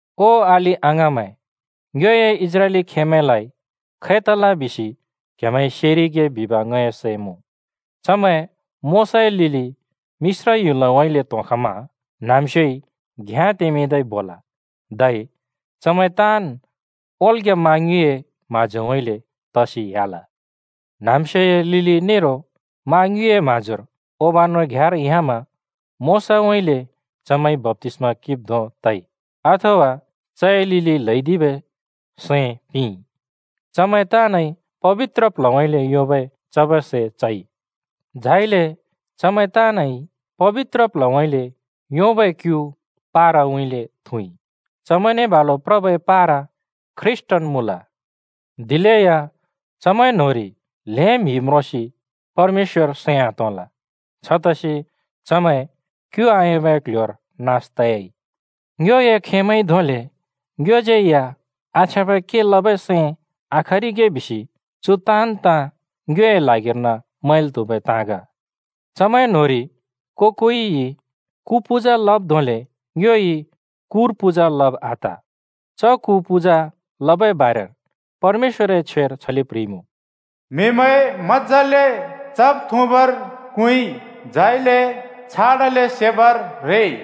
ओ अलि-अङाँमैं, ङ्योए इस्राएली खेमैंलाइ खै तल बिसि क्‍हेमैंइ सेरिगे बिब ङए सैं मुँ, चमैं मोशाए लिलि मिश्र ह्‍युलउँइँले त्‍होंखमा न्‍हाँम्‍स्योइ घ्याँ तेंमिंदै बोल, धै चमैं ताँन् ओल्ग्‍या मा ङ्युँइए म्हाँजोउँइँले तसि ह्‍याल। न्‍हाँम्‍स्योए लिलि नेरो मा ङ्युँइए म्हाँजोर [ओबानो घ्‍याँर] ह्‍यामा मोशाउँइँले चमैंइ बप्‍तिस्‍मा किंब् धों तइ [अथवा चए लिलि ल्‍हैदिबै सैं पिंइ]। चमैं ताँनइ पबित्र प्ल्हउँइँले योंबै चबै सै चइ। झाइले चमैं ताँनइ पबित्र प्ल्हउँइँले योंबै क्यु पाराउँइँले थुँइ। चमैंने बालु प्रबै पारा ख्रीष्‍टन् मुँल। दिलेया चमैं न्होंरि ल्हें म्हि म्रोंसि परमेश्‍वर सैं आतोंल, छतसि चमैं क्यु आयोंबै क्ल्ह्‍योर नास तयाइ। ङ्योए खेमैंइ धोंले ङ्योज्यै या आछ्याँबै के लबै सैं आखरिगे बिसि चु ताँन् ताँ ङ्योए ल्हागिर्न मैंल् त्हुबै ताँ ग। चमैं न्‍होंरि को-कोइ कु पूजा लब् धोंले ङ्योइ कुर पूजा लब आत। च कु पूजा लबै बारेर परमेश्‍वरए छ्वेर छले प्ह्रिइमुँ, “म्‍हिमैं [कुर पूजा लमा] मज्‍जाले चब्-थुँबर क्हुँइ, झाइले छाडाले सेबर रेइ।”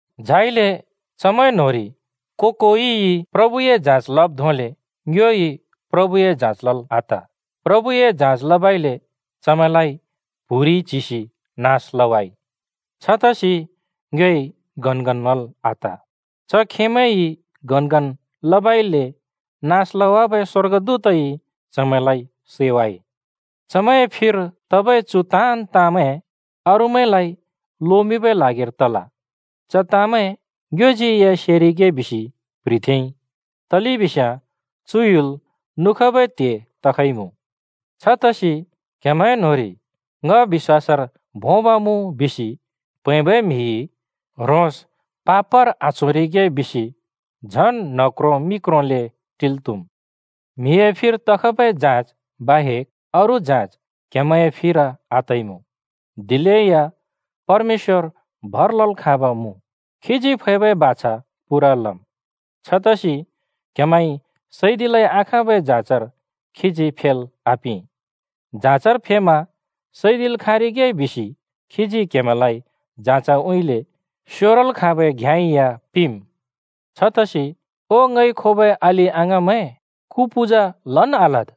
झाइले चमैं न्‍होंरि को-कोइ प्रभुए जाँच लब् धोंले ङ्योइ प्रभुए जाँच लल् आत। प्रभुए जाँच लबइले चमैंलाइ प्‍हुरिइ नास लवाइ। छतसि ङ्योइ गनगन लल् आत, च खेमैंइ गनगन लबइले नास लवाबै स्‍वर्गदूतइ चमैंलाइ सैवाइ। चमैंए फिर तबै चु ताँन् ताँमैं अरूमैंलाइ लोमिंबै ल्हागिर तल। च ताँमैं ङ्योज्यै सेरिगे बिसि प्‍ह्रिथेंइ। तलेबिस्याँ चु ह्‍युल नुखबै त्हे तखइमुँ। छतसि क्‍हेमैं न्‍होंरि ङ बिश्‍वासर भोंब् मुँ बिसि प्‍हैंबै म्‍हिइ ह्रोंस पापर आच्होरिगे बिसि झन् न्ह क्रों मि क्रोंले टिल् त्‍हुम्। म्हिए फिर तखबै जाँच बाहेक अरू जाँच क्‍हेमैंए फिर आतइमुँ। दिलेया परमेश्‍वर भर लल् खाँब मुँ, खीजी फैबै बाछा पूरा लम्। छतसि क्‍हेमैंइ सैदिलै आखाँबै जाँचर खीजी फेल् आपिं। जाँचर फेमा सैदिल् खाँरिगे बिसि खीजी क्हेमैंलाइ जाँचउँइँले स्योरल् खाँबै घ्याँ या पिंमुँ। छतसि ओ ङइ खोबै अलि-अङाँमैं, कु पूजा लन् आलद्।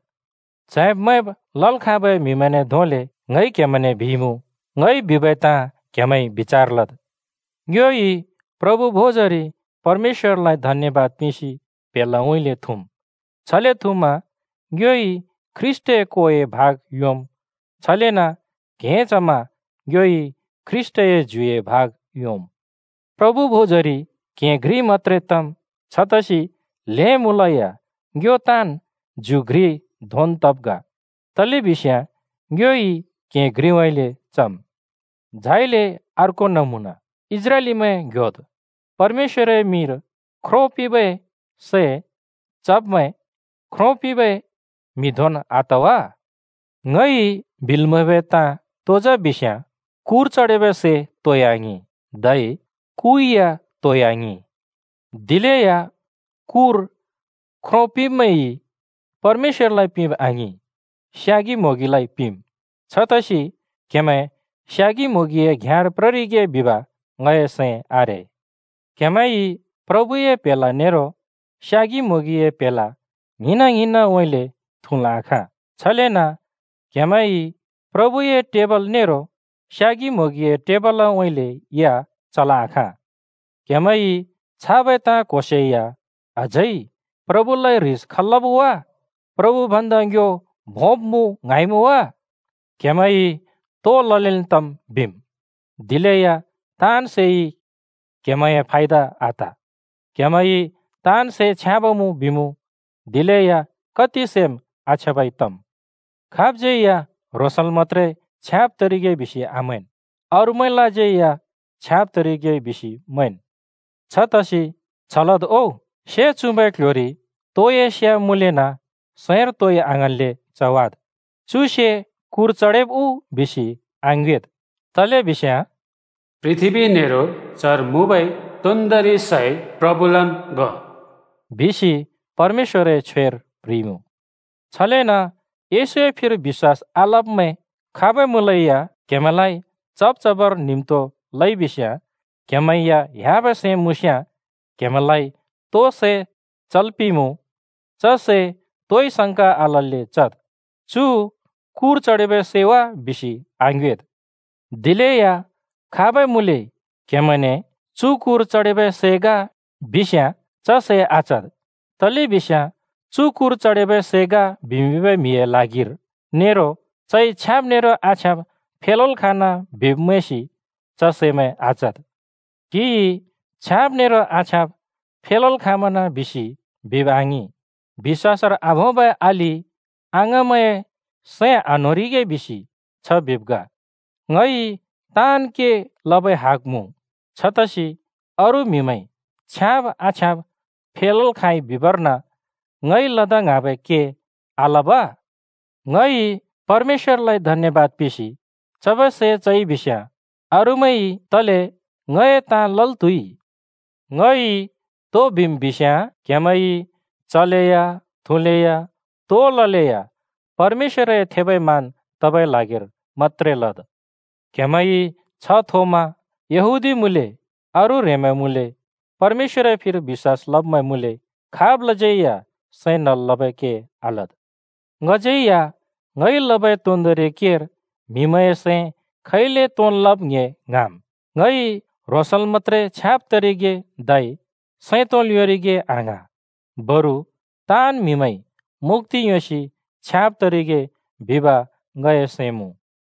च्हैंब् मैंब् लल् खाँबै म्हिमैंने धोंले ङइ क्हेमैंने बिइमुँ, ङइ बिबै ताँ क्हेमैंइ बिचार लद्। ङ्योइ प्रभु भोजरि परमेश्‍वरलाइ धन्‍यबाद पिंसि प्‍हेलाउँइँले थुँम्। छले थुँमा ङ्योइ ख्रीष्‍टए कोए भाग योंम्। छलेन क्‍हें चमा ङ्योइ ख्रीष्‍टए ज्युए भाग योंम्। प्रभु भोजरि क्‍हें घ्रि मत्‍त्रे तम्। छतसि ल्हें मुँलेया ङ्यो ताँन् ज्यु घ्रि धोंन् तब् ग, तलेबिस्याँ ङ्योइ क्‍हें घ्रिउँइँले चम्। झाइले अर्को नमुना: इस्राएलीमैं ङ्‍ह्‍योद्, परमेश्‍वरए मिंर ख्रो पिंबै सै चब्‍मैं ख्रो पिंबै म्हिने घ्रिन् तइ। ङइ बिल् म्हैब तो जा बिस्‍याँ “कुर चडेबै सै तोइ आङिं!” धै “कु या तोइ आङिं!” दिलेया कुर ख्रो पिंब्‍मैंइ परमेश्‍वरलाइ पिंब आङिं, स्यागि म्होंगिलाइ पिंम्। छतसि क्‍हेमैं स्यागि म्होंगिए घ्याँर प्ररिगे बिब ङए सैं आरे। क्‍हेमैंइ प्रभुए प्‍हेला नेरो स्यागि म्होंगिए प्‍हेला ङ्हिंना ङ्हिंनउँइँले थुँल् आखाँ। छलेन क्‍हेमैंइ प्रभुए टेबल नेरो स्यागि म्होंगिए टेबलउँइँले या चल् आखाँ। क्हेमैंइ छाबै ताँ क्‍होसे या अझै प्रभुलाइ ह्रिस खल् लब् वा? प्रभु भन्दा ङ्यो भोंब मुँ ङ्हाँइमुँ वा? “क्हेमैंइ तो ललेन् तम्,” बिम्। दिलेया ताँन् सैइ क्हेमैंए फायदा आत। क्हेमैंइ “ताँन् सै छ्याँब मुँ बिमुँ,” दिलेया कति सैम् आछ्याँबै तम्। खाबज्यै या ह्रोंसल् मत्‍त्रे छ्याँब तरिगे बिसि आमैंन्, अरूमैंलाज्यै छ्याँब तरिगे बिसि मैंन्। छतसि छ लद् ओ: से चुँबै क्‍ल्‍ह्‍योरि तोए से मुँलेना सैंर तोइ आङ्हाँन्‍ले चवाद्। “चु से कुर चडेब् उ?” बिसि आङ्योएद्। तलेबिस्याँ “पृथ्‍बी नेरो चर मुँबै तोन्दोंरि सै प्रभुलन् ग,” बिसि परमेश्‍वरए छ्वेर प्ह्रिइमुँ। छलेन येशूए फिर बिश्‍वास आलब्‍मैं खाबै मुँलेया क्‍हेमैंलाइ चब् चबर न्हिम्तो लइबिस्‍याँ, क्‍हेमैं या ह्‍याबै सैं मुँस्‍याँ, क्‍हेमैंलाइ तो सै चल् पिंमुँ, च सै तोइ संका आलल्‍ले चद्। चु कुर चडेबै सै वा बिसि आङ्योएद्। दिलेया खाबै मुँले क्‍हेमैंने, “चु कुर चडेबै सै ग,” बिस्‍याँ च सै आचद्। तलेबिस्‍याँ, चु कुर चडेबै सै ग बिमिंबै म्‍हिए ल्हागिर नेरो चइ छ्याँब् नेरो आछ्याँब फेलल् खाँना बिब् मैंसि च सैमैं आचद्। क्‍हिइ छ्याँब् नेरो आछ्याँब फेलल् खाँमना बिसि बिब् आङिं, बिश्‍वासर आभोंबै अलि अङाँमैंए सैं आन्होंरिगे बिसि छ बिब् ग। “ङइ ताँन् के लबै हग मुँ। छतसि अरू म्‍हिमैंइ छ्याँब् आछ्याँब फेलल् खाँइ बिबर्न ङइ लदा ङ्हाँबै के आलब?” ङइ परमेश्‍वरलाइ धन्‍यबाद पिंसि चबै सै चइ बिस्‍याँ अरूमैंइ तले ङए ताँ लल् त्हुइ? ङइ तो बिम् बिस्‍याँ: क्‍हेमैंइ चलेया, थुँलेया, तो ललेया परमेश्‍वरए थेबै मान तबै ल्हागिर मत्‍त्रे लद्। क्‍हेमैंइ छ्ह थोमा यहूदी मुँले, अरू ह्रेंमैं मुँले, परमेश्‍वरए फिर बिश्‍वास लब्मैं मुँले, खाबलाज्यै या सैं नल् लबै के आलद्। ङज्यै या ङइ लबै तोन्दोंरि केर म्हिमैंए सैं खैले तोंन् लब् ङ्‍हे ङ्हाँम्। ङइ ह्रोंसल् मत्‍त्रे छ्याँब् तरिगे धै सैं तोंल् योंरिगे आङ्हाँ, बरु ताँन् म्हिमैंइ मुक्‍ति योंसि छ्याँब् तरिगे बिब ङए सैं मुँ।